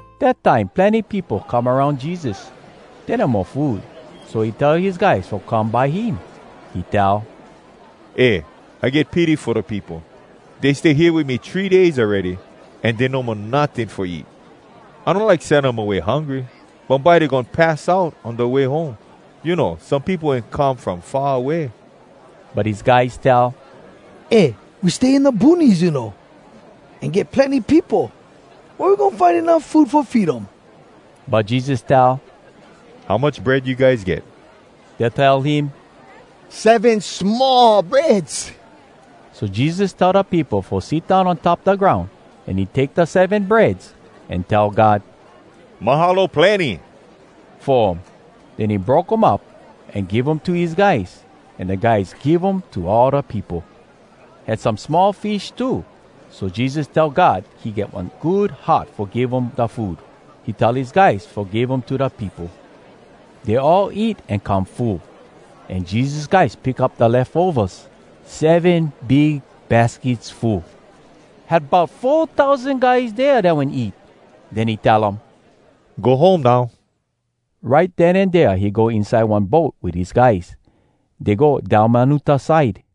Dat time plenny peopo come aroun Jesus. Dey no mo food, so he tell his guys fo come by him. He tell, “Eh, I get pity fo da peopo. Dey stay hea wit me three days awready, an dey no mo notting fo eat. I no like sen um away hungry. Bumbye dey goin pass out on da way home. You know, some peopo wen come from far away.” But his guys tell, “Eh, we stay in da boonies, you know. An get plenny peopo. Wea we goin find enuff food fo feed um?” But Jesus tell, “How much bread you guys get?” Dey tell him, “Seven small breads.” So Jesus tell da peopo fo sit down on top da groun. An he take da seven breads, an tell God “Mahalo plenny!” fo um. Den he broke um up, an give um to his guys. An da guys give um to all da peopo. Had some small fish too. So Jesus tell God he get one good heart fo give um da food. He tell his guys fo give um to da peopo. Dey all eat an come full. An Jesus guys pick up da lefovas, seven big baskets full. Had bout four tousan guys dea dat wen eat. Den he tell um, “Go home now.” Right den an dea he go inside one boat wit his guys. Dey go Dalmanuta side.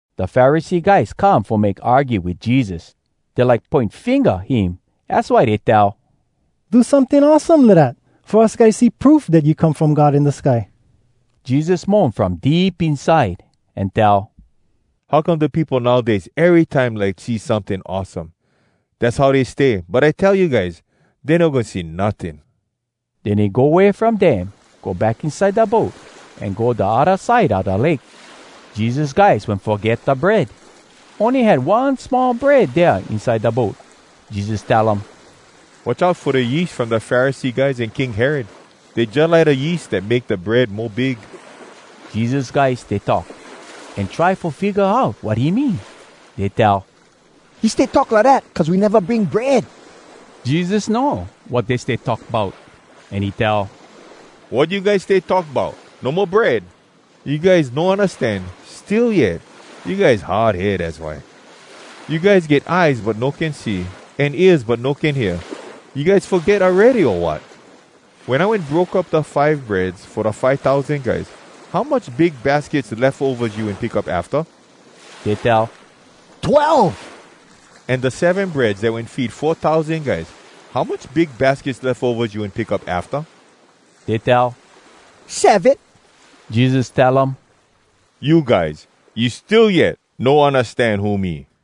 Da Pharisee guys come fo make argue wit Jesus. Dey like poin finga him, az why dey tell, “Do someting awesome lidat, fo us guys see proof dat you come from God in da sky.” Jesus moan from deep inside, an tell, “How come da peopo nowdays erytime like see someting awesome? Dass how dey stay, but I tell you guys, dey no goin see notting!” Den he go way from dem, go back inside da boat, an go da odda side a da lake. Jesus guys wen foget da bread. Ony had one small bread dea inside da boat. Jesus tell um, “Watch out fo da yeast from da Pharisee guys an King Herod. Dey jalike da yeast dat make da bread mo big.” Jesus guys stay talk, an try fo figga out wat he mean. Dey tell, “He stay talk lidat cuz we neva bring bread!” Jesus know wat dey stay talk bout, an he tell, “Wat you guys stay talk bout, no mo bread?! You guys no undastan, still yet? You guys hard head, az why. You guys get eyes but no can see, an ears but no can hear. You guys foget awready, o wat?! Wen I wen broke up da five breads fo da five tousan guys, how much big baskets lefovas you wen pick up afta?” Dey tell, “Twelve.” “An da seven breads dat wen feed four tousan guys, how much big baskets lefovas you wen pick up afta?” Dey tell, “Seven.” Jesus tell um, “You guys! You still yet no undastan who me!”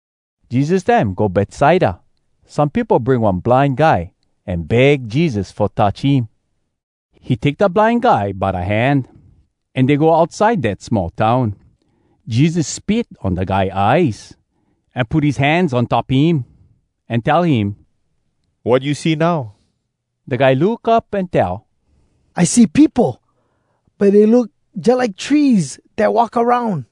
Jesus dem go Betsaida. Some peopo bring one blind guy, an beg Jesus fo touch him. He take da blind guy by da hand, an dey go outside dat small town. Jesus spit on da guy eyes, an put his hands on top him, an tell him, “Wat you see now?” Da guy look up an tell, “I see peopo, but dey look jalike trees dat walk aroun!”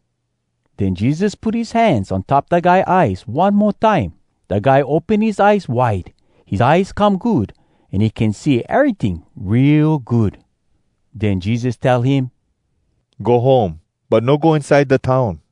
Den Jesus put his hands on top da guy eyes one mo time. Da guy open his eyes wide, his eyes come good, an he can see eryting real good. Den Jesus tell him, “Go home, but no go inside da town.”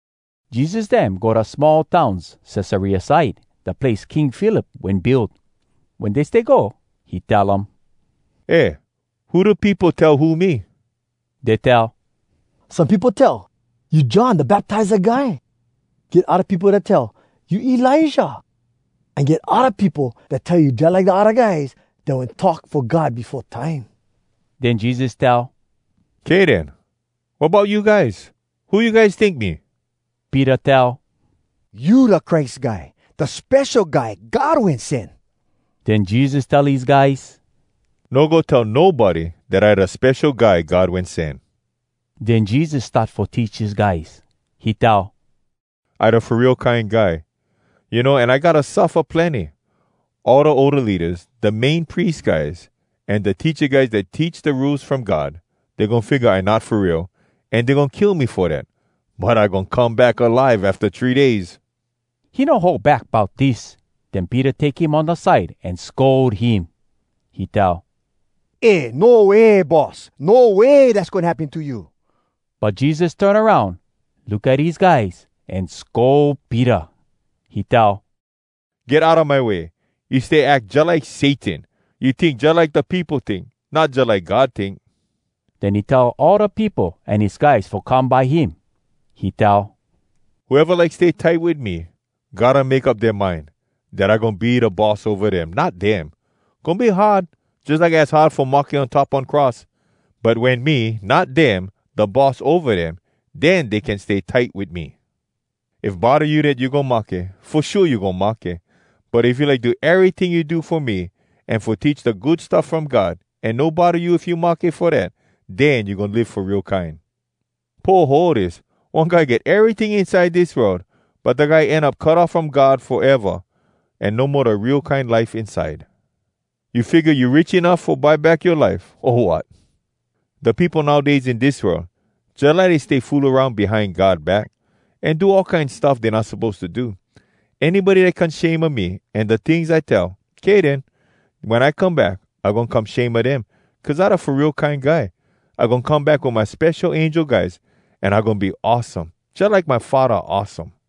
Jesus dem go da small towns Cesarea side, da place King Philip wen build. Wen dey stay go, he tell um: “Eh, who da peopo tell who me?” Dey tell, “Some peopo tell, you John Da Baptiza Guy. Get odda peopo dat tell, you Elijah. An get odda peopo dat tell you jalike da odda guys dat wen talk fo God befo time.” Den Jesus tell, “Kay den. Wat bout you guys? Who you guys tink me?” Peter tell, “You da Christ Guy, Da Spesho Guy God Wen Sen.” Den Jesus tell his guys, “No go tell nobody dat I da Spesho Guy God Wen Sen.” Den Jesus start fo teach his guys. He tell, “I Da Fo Real Kine Guy, you know, an I gotta suffa plenny. All da older leadas, da Main Pries guys, an da teacha guys dat teach da Rules From God, dey goin figga I not fo real, an dey goin kill me fo dat. But I goin come back alive afta three days.” He no hold back bout dis. Den Peter take him on da side an scold him. He tell, “Eh! No way, Boss! No way dass goin happen to you!” But Jesus turn aroun, look at his guys, an scold Peter. He tell, “Get outa my way. You stay ack jalike Satan! You tink jalike da peopo tink, not jalike God tink.” Den he tell all da peopo an his guys fo come by him. He tell, “Whoeva like stay tight wit me, gotta make up dea mind, dat I goin be da boss ova dem, not dem. Goin be hard, jalike az hard fo mahke on top one cross. But wen me, not dem, da boss ova dem, den dey can stay tight wit me. If bodda you dat you goin mahke, fo shua you goin mahke. But if you like do eryting you do fo me, an fo teach da Good Stuff From God, an no bodda you if you mahke fo dat, den you goin live fo real kine. Poho dis: one guy get eryting inside dis world, but da guy end up cut off from God foeva, an no mo da real kine life inside. You figga you rich enuff fo buy back yoa life, o wat? “Da peopo nowdays in dis world, jalike dey stay fool aroun behind God back, an do all kine stuff dey not suppose to do. Anybody dat come shame a me an da tings I tell, kay den, wen I come back, I goin come shame a dem, cuz I da Fo Real Kine Guy. I goin come back wit my spesho angel guys, an I goin be awesome, jalike my Faddah awesome.”